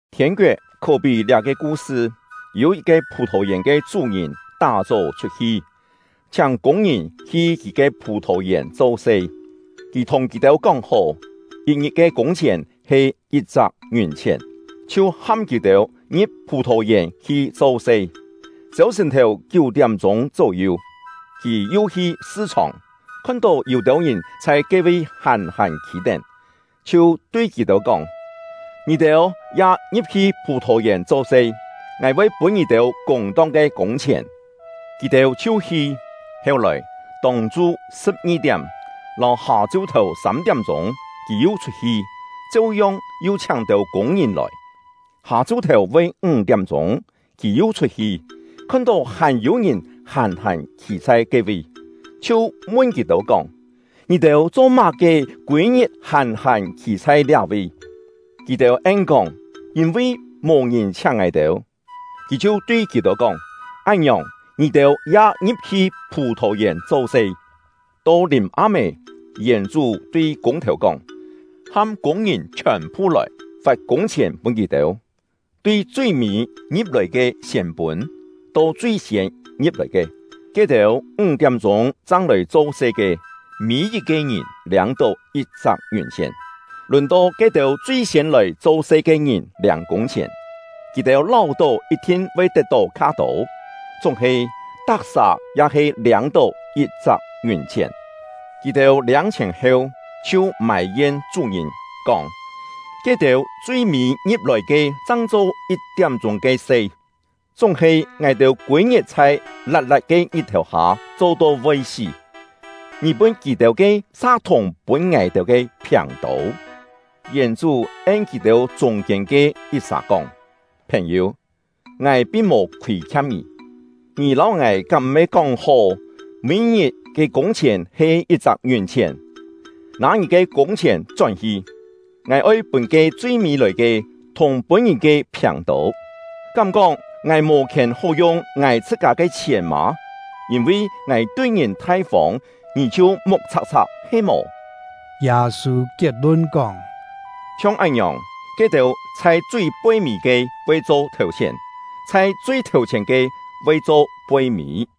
“Thiên-koet khó-pí liá-ke ku-sṳ: Yû yit-ke phù-thò-yèn ke chú-ngìn tá-chó chhut-hi, chhiáng kûng-ngìn hi kì ke phù-thò-yèn cho-se. Kì thùng kì-têu kóng-hó, yit-ngit ke kûng-chhièn he yit-chak ngiùn-chhièn, chhiu ham kì-têu ngi̍p phù-thò-yèn hi cho-se. Chêu-sṳ̀n-thèu kiú-tiám-chûng chó-yu, kì yu hi sṳ-chhòng, khon-tó yû-têu ngìn chhai ke-vi hàn-hàn khî-tén, chhiu tui kì-têu kóng: ‘Ngì-têu ya ngi̍p-hi phù-thò-yèn cho-se; ngài voi pûn ngì-têu kûng-tong ke kûng-chhièn.’ Kì-têu chhiu hi. Heu-lòi, tông-chu sṳ̍p-ngi-tiám, lâu hâ-chu-thèu sâm-tiám-chûng, kì yu chhut-hi, cheu-yong yu chhiáng têu kûng-ngìn lòi. Hâ-chu-thèu voi ńg-tiám-chûng, kì yu chhut-hi, khon-tó hàn yû-ngìn hàn-hàn khî chhai ke-vi, chhiu mun kì-têu kóng: ‘Ngì-têu cho-má-ke kûi-ngit hàn-hàn khî chhai liá-vi?’ Kì-têu en-kóng: ‘Yîn-vi mò-ngìn chhiáng ngài-têu.’ Kì chhiu tui kì-têu kóng: ‘Án-ngiòng, ngì-têu ya ngi̍p-hi phù-thò-yèn cho-se.’ “To lìm-am-é, yèn-chú tui kûng-thèu kóng: ‘Ham kûng-ngìn chhiòn-phu lòi, fat kûng-chhièn pûn kì-têu, tui chui-mî ngi̍p-lòi ke siên pûn, to chui-siên ngi̍p-lòi ke.’ Ke-têu ńg-tiám-chûng chang lòi cho-se ke, mî-yit-ke ngìn liâng-tó yit-chak ngiùn-chhièn. Lùn-to ke-têu chui-siên lòi cho-se ke ngìn liâng kûng-chhièn, kì-têu láu-tó yit-thin voi tet-tó kha-tô, chúng-he tak-sà ya he liâng-tó yit-chak ngiùn-chhièn. Kì-têu liâng-chhièn heu, chhiu mài-yen chú-ngìn, kóng: ‘Ke-têu chui-mî ngi̍p-lòi ke chang cho yit-tiám-chûng ke se, chúng-he ngài-têu kûi-ngit chhai lat-lat ke ngit-thèu hâ cho-to voi sí, ngì pûn kì-têu ke sa thùng pûn ngài-têu ke phiàng-tô!’ Yèn-chú en kì-têu chûng-kiên ke yit-sà kóng: ‘Phèn-yû, ngài pin mò khûi-khiam ngì. Ngì lâu ngài kám m̀-he kóng-hó, mî-ngit ke kûng-chhièn he yit-chak ngiùn-chhièn? Nâ ngì ke kûng-chhièn chón-hi! Ngài oi pûn ke chui-mî lòi ke, thùng pûn ngì ke phiàng-tô; kám-kóng ngài mò khièn hó yung ngài chhṳ-kâ ke chhièn mâ? Yîn-vi ngài tui ngìn thai-fông, ngì chhiu muk chhak-chhak he-mò?’” Yâ-sû kiet-lun kóng: “Chhiong án-ngiòng, ke-têu chhai chui poi-mî ke voi cho thèu-chhièn; chhai chui thèu-chhièn ke voi cho poi-mî.”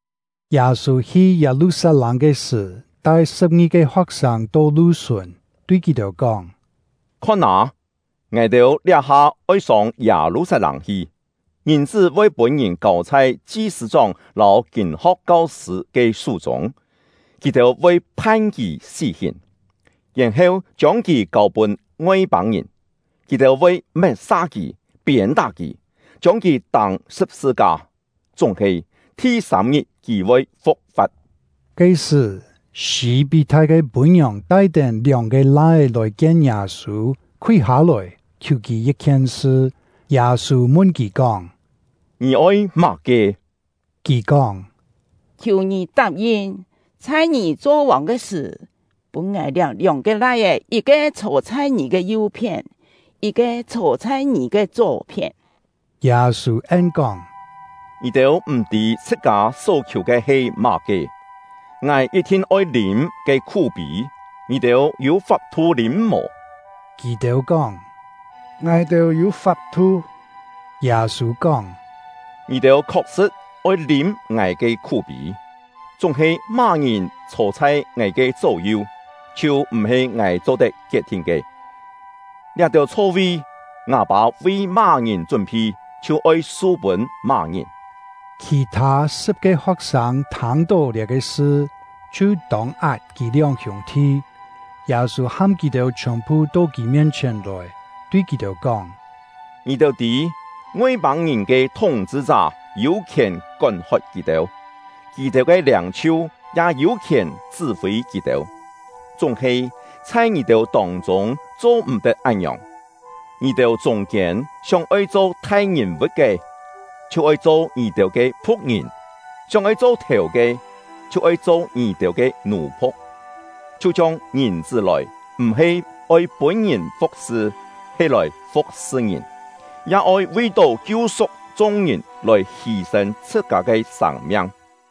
Yâ-sû hi Yâ-lu-sat-lâng ke sṳ̀, tai sṳ̍p-ngi-ke ho̍k-sâng to lu-sùn, tui kì-têu kóng: “Khon â, ngài-têu liá-ha oi sông Yâ-lu-sat-lâng hi; Ngìn-chṳ́ voi pûn-ngìn kâu chhai chi-sṳ̂-chóng lâu kîn-ho̍k kau-sṳ̂ ke sú-chûng. Kì-têu voi phan kì sí-hìn, yèn-heu chiông kì kâu-pûn Ngoi-pâng-ngìn. Kì-têu voi met-sa kì, piên-tá kì, chiông kì tâng sṳ̍p-sṳ-ka; chúng-he, thi-sâm-ngit kì voi fu̍k-fa̍t.” Ke-sṳ̀, Sî-pí-thai ke pû-ngiòng tai-tén lióng-ke lai-é lòi-kien Yâ-sû, khúi hâ-lòi, khiù kì yit-khien sṳ. Yâ-sû mun kì kóng: “Ngì oi má-ke?” Kì kóng: “Khiù ngì tap-yin, chhai ngì cho vòng ke sṳ̀, pûn ngài liá lióng-ke lai-é yit-ke chhô chhai ngì ke yu-phién, yit-ke chhô chhai ngì ke chó-phién.” Yâ-sû en-kóng: “Ngì-têu m̀-tî chhṳ-kâ só khiù ke he má-ke. Ngài yit-thin oi lîm ke khú-pî, ngì-têu yû fap-thu lîm mò?” Kì-têu kóng: “Ngài-têu yû fap-thu!” Yâ-sû kóng: “Ngì-têu khok-sṳ̍t oi lîm ngài ke khú-pî; chúng-he má-ngìn chhô chhai ngài ke chó-yu, chhiu m̀-he ngài cho-tet kiet-thin ke. Liá-têu chho-vi, ngâ Pâ vi má-ngìn chún-phi, chhiu oi su-pûn má-ngìn.” Khì-thâ sṳ̍p-ke ho̍k-sâng thâng-tó liá-ke sṳ, chhiu tông-at kì lióng hiûng-thi. Yâ-sû ham kì-têu chhiòn-phu to kì mien-chhièn lòi, tui kì-têu kóng: “Ngì-têu tî, Ngoi-pâng-ngìn ke thúng-chhṳ-chá yû khièn kón-hot kì-têu, kì-têu ke liâng-chhiu ya yû khièn chṳ́-fî kì-têu; chúng-he, chhai ngì-têu tông-chûng cho-m̀-tet án-ngiòng. Ngì-têu chûng-kiên sióng-oi cho thai-ngìn-vu̍t ke, chhiu oi cho ngì-têu ke phu̍k-ngìn; sióng-oi cho thèu ke, chhiu oi cho ngì-têu ke nù-phu̍k; chhiu-chhiong Ngìn-chṳ́ lòi, m̀-he oi pûn-ngìn fu̍k-sṳ, he lòi fu̍k-sṳ ngìn, ya oi vi-tó kiu-su̍k chung-ngìn lòi hî-sên chhṳ-kâ ke sâng-miang.”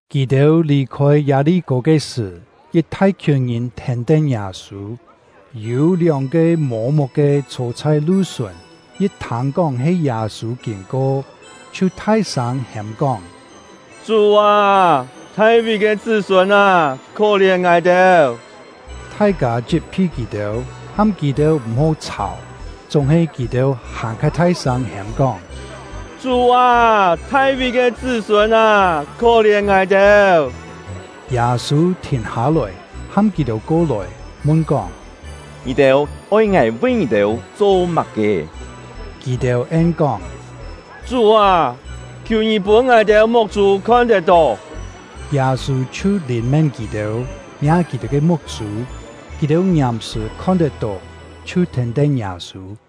Kì-têu lì-khôi Yâ-li-kô ke sṳ̀, yit thai-khiùn ngìn thèn-tén Yâ-sû. Yû lióng-ke mô-muk-ke chhô chhai lu-sùn, yit thâng-kóng he Yâ-sû kîn-ko, chhiu thai-sâng hêm-kóng: “Chú â Yû-têu kú-kién mò “Chú â”., Thai-ví ke chṳ́-sûn â, khó-lièn ngài-têu!” Thai-kâ chit-phi kì-têu, ham kì-têu m̀-hó chhàu; chúng-he kì-têu hàn-kha thai-sâng hêm-kóng: “Chú â, Thai-ví ke chṳ́-sûn â, khó-lièn ngài-têu!” Yâ-sû thìn hâ-lòi, ham kì-têu ko-lòi, mun-kóng: “Ngì-têu oi ngài vi ngì-têu cho má-ke?” Kì-têu en-kóng: “Chú â, khiù ngì pûn ngài-têu muk-chû khon-tet-tó!” Yâ-sû chhiu lìn-mén kì-têu, miâ kì-têu ke muk-chû; kì-têu ngiàm-sṳ̀ khon-tet-tó, chhiu thèn-tén Yâ-sû.